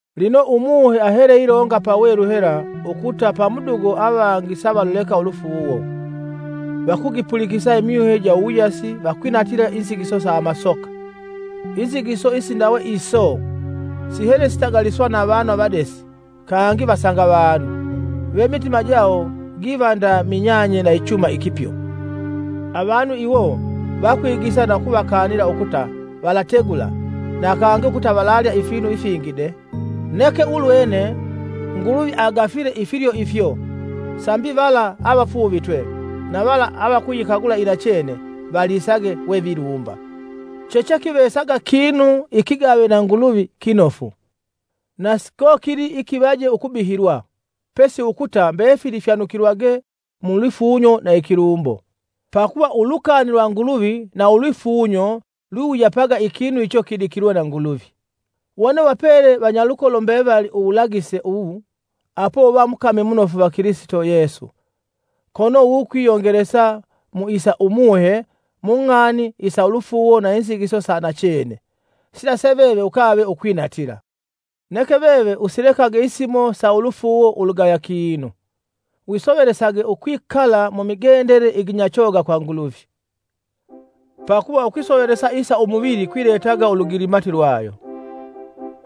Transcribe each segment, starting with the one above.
Lino Umuhe ahele ilonga pawelu hela ukuta pamudugo avangi savaluleka ulufuuwo; vakugipulikisa imyuhe ja uwuyasi akwinatila inzigiso sa amasoka. Inzigiso isindawe iso, sihele sitagaliswa na avanu avadesi kangi vasanga vanu, ve imitima jawo giva nda minyanye na ichuma ikipyo. Avanu iwo vakwigisa na ukuvakanila ukuta valitegula na kangi ukuta valalya ifinu ifingi de. Neke ulwene Nguluvi agafile ifilyo ifyo, sambi vala avafuuvitwe na vala avakuyikagula inachene valisage we vilumba. Chechekivesaga kinu ikigave na Nguluvi kinofu, na sikokili ikivaje ukubihilwa, pesi ukuta mbefili fyanukilwage mu lwifunyo na ikilumbo, pakuva ulukani lwa Nguluvi na ulwifunyo lwiwuyapaga ikinu icho kidikilwe na Nguluvi. Wone uvapele vanyalukolo mbevali uwulagise uwu, apo uva mukami munofu va Kilisito Yesu, kono wukwiyongelesa mu isa Umuhe mung'ani isa ulufuuwo na inzigiso sa nachene, sila se veve ukave ukwinatila. Neke veve usilekage isimo sa ulufuuwo ulugaya kinu. Wisovelesage ukwikala mumigendele iginyachoga kwa Nguluvi. Pakuva ukwisovelesa isa umuvili kwiletaga ulugilimati kwayo,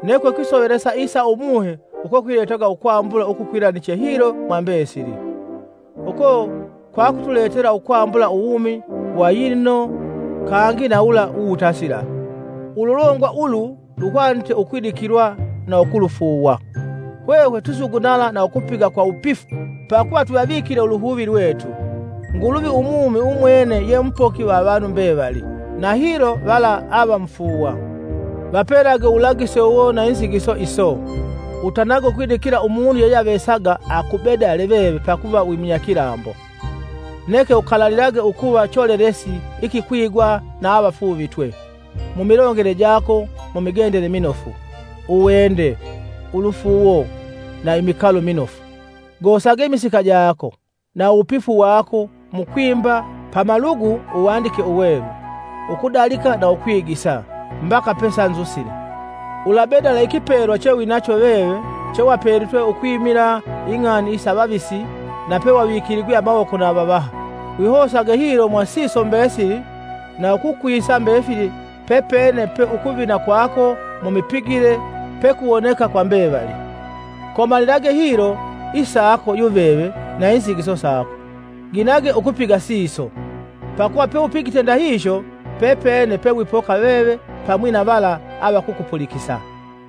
neke ukwisovelesa isa Umuhe uko kwiletaga ukwambula ukukwilaniche hilo mwa mbesili, uko kwakutuletela ukwambula uwumi wa yilino kangi na wula uwutasila. Ululongwa ulu luhwanite ukwidikilwa na ukulufuuwa. Hwehwe twisugunala na ukupiga kwa wupifu pakuva twivavikile uluhuvi lwetu, Nguluvi umumi umwene ye mupoki va avanu mbevali, na hilo vala avevamufuuwa. Vapelage uwulagise uwo na inzigiso iso. Utanage ukwidikila umunu yeyeavesaga ukubedala veve pakuva wimunyakilambo, neke ukalalilage ukuva cholelesi ikikwigwa na avafuuvitwe, mumilongele jako, mumigendele minofu, uwende, ulufuuwo na imikalo minofu. Gosage imisika jako, na uwupifu wako mukwimba pamalugu Uwandike Uwelu, ukudalika na ukwigisa, mbaka pesanzusile. Ulabedala ikipelwa chewinacho veve chewapelitwe ukwimila ing'ani isa avavisi na pewavikiligwe amawoko na avavaha. Wihosage hilo mwa siso mbesili na ukukwisa mbefili pepene pe ukuvina kwako mumipigile pekuwoneka kwa mbevali. Komalilage hilo isako yuveve na inzigiso sako. Ginage ukupiga siso, pakuva peupigite ndahihyo, pepene pe wipoka veve pamwi na vala avakukupulikisa.